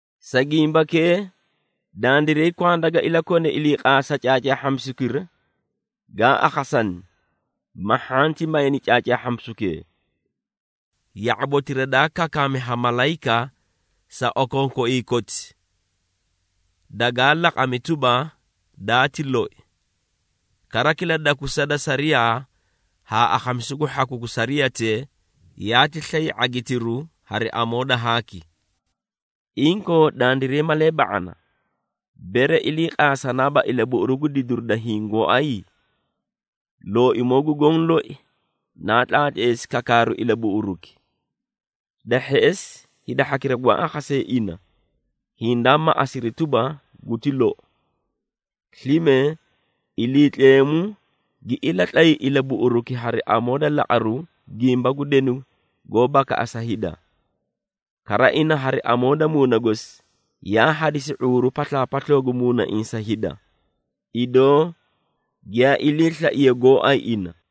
Sa gimbakee, dandiray kwanda ga ilakone iliiqaasa caacaahhamisukira gaa akhasani, ma hhanti mayni caacaahhamisukee. Ya⁄abotira daa kakaami ha malayika sa okookoiĩ koti dagaa laqami tuba, daati loi. Kara kila dakusa da sariyaa haa akhamisu gu hhaku gu sariyatee, yaati slay ⁄agitiru hari amoo da haaki. Inkoo, dandiray malee ba⁄ana, bere iliiqaasanaaba ilabuꞌuru gu didiru da hiĩ gooay? Looimoo gu Goõ loi naa tlaatleesi kakaaru ilabuꞌuruki. Da hheꞌesi, hida hhakira gwaa akhasee ina hindaa maꞌasiri tuba, guti lou. Slime, Iliitleemu gi ilatlay ilabuꞌuruki hari amoo da laqaru gimba gu denu goó bakaꞌasa hida. Kara, ina hari amoo da Muuna gosi yaa hadisi ⁄uuru paslaapasloo gu muunaiĩ sa hida, idoo giyaa iliislaiye gooay ina.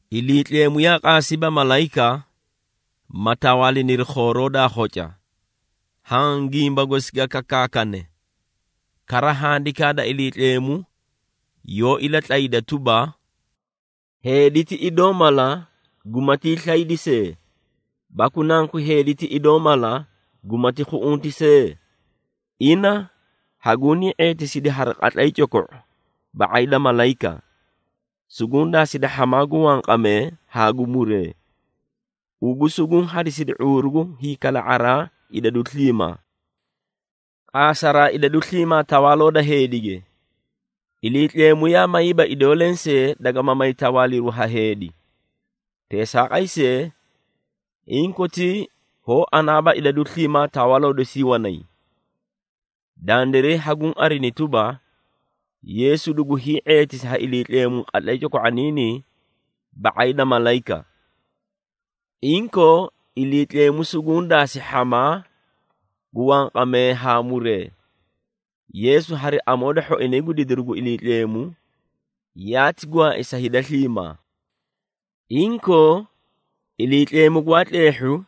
Iliitleemu yaa qaasiiba malayika, ma tawaaliniri khooroo daa khoca, haã gimba gosi ga kakaakane. Kara Handikaa da Iliitleemu yoó ilatlayda tuba, “Heedi ti idoo mala gumatii slaydi see, baku nanku heedi ti idoo mala gumati khuꞌunti see? Ina hagunii ⁄eetisidi hari qatlay coko⁄u ba⁄ay da malayika. Suguũ daasidi hhamaa gu wanqamee haa gu muree. Ugu suguũ hadisidi ⁄uuru gu hiikala⁄araa idadu sliimaa.” Qaasaraa idadu sliimaa tawaaloo da heedige, Iliitleemu yaa mayiiba idoo lensee, dagama may tawaaliru ha heedi. Teesaaqay see, inkotii hoó anaaba idadu sliimaa tawaaloo dosii wanay. Dandiray haguũ arini tuba, Yeesu dugu hii⁄eetisi ha Iliitleemu qatlay coko⁄oniinii ba⁄ay da malayika. Inkoo, Iliitleemu suguũ daasi hhamaa gu wanqamee haa muree. Yeesu hari amoo da hhoinay gu didiru gu Iliitleemu, yaati gwaai sa hida sliimaa. Inkoo, Iliitleemu gwaa tleehhu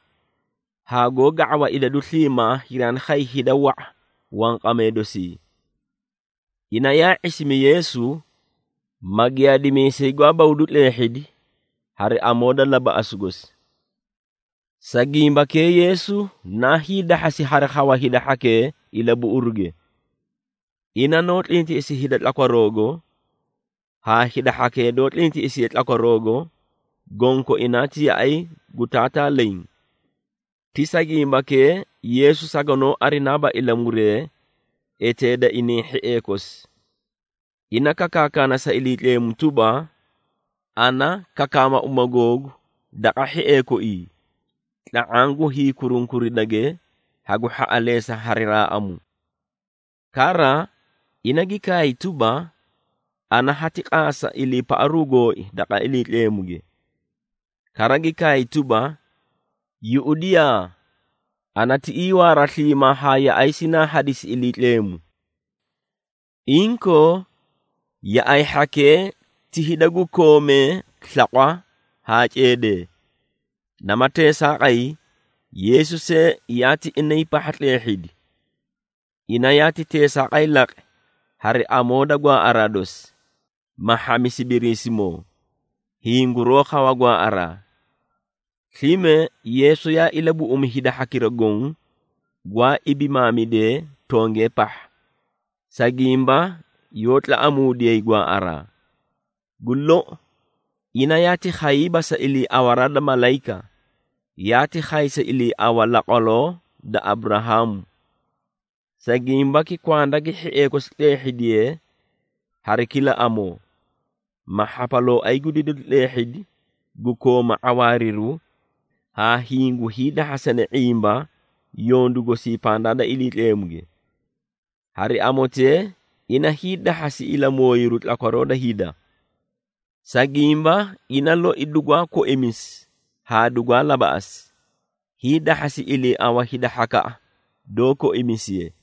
haa goó ga⁄awa idadu sliimaa hiraani khay hida wa⁄a wanqamee dosii. Ina yaa ⁄isimi Yeesu, ma giyaadimiisay gwaa buꞌudu tleehhidi hari amoo da labaꞌasu gosi. Sa gimbakee Yeesu na hiidahhasi hari khawa hida hhakee ilabuꞌuruge. Ina noó tlintiꞌisi hida tlakwaroogo, haa hida hhakee doó tlintiꞌisiye tlakwaroogo, gonkoinaa ti yaꞌay gu Taataa leẽ. Ti sa gimbakee, Yeesu saganoó arinaaba ilamuree eteeda inay hhiee kosi. Ina kakaana sa Iliitleemu tuba, “Ana kakaama uma googu daqa hhiee koii, tla⁄aã gu hiikurunkuridage hagu hhaꞌaleesa hari raaꞌamu.” Kara, ina gi kaay tuba, “Ana hati qaasa iliipaꞌaru gooi daqa Iliitleemuge.” Kara gi kaay tuba, “Yuꞌudiyaa! Ana tiꞌii waara sliimaa haa yaꞌay sinaa hadisi Iliitleemu.” Inkoo, yaꞌay hhakee ti hida gu koomee slaqwa haa ceedee, nama teesaaqay Yeesu see yaati inay pahha tleehhidi. Ina yaati teesaaqay laqi, hari amoo da gwaaꞌaraa dosi, ma hhamisi Biriisimoo, hiĩ guroó khawa gwaaꞌaraa. Slime, Yeesu yaa ilabuꞌumi hida hhakira goõ, gwaa ibimaamidee tongee pahha, sa gimba yoó tlaꞌamuudiyay gwaaꞌaraa. Gu lou, ina yaati khayiiba sa iliiawaraa da malayika, yaati khay sa iliiawa laqwaloo da Aburahaamu. Sa gimbaki kwanda gi hhiee kosi tleehhidiye hari kila amoo, ma hhapalooay gu didiru tleehhidi gu kooma ⁄awaariru haa hiĩ gu hiidahhasane ⁄imba yondu gosii pandaa da Iliitleemuge. Hari amotee, ina hiidahhasi ilamooyiru tlakwaroo da hida. Sa gimba, ina loi dugwaa koimisi haa dugwaa labaꞌasi, hiidahhasi iliiawa hida hhakaꞌa doó koimisiye.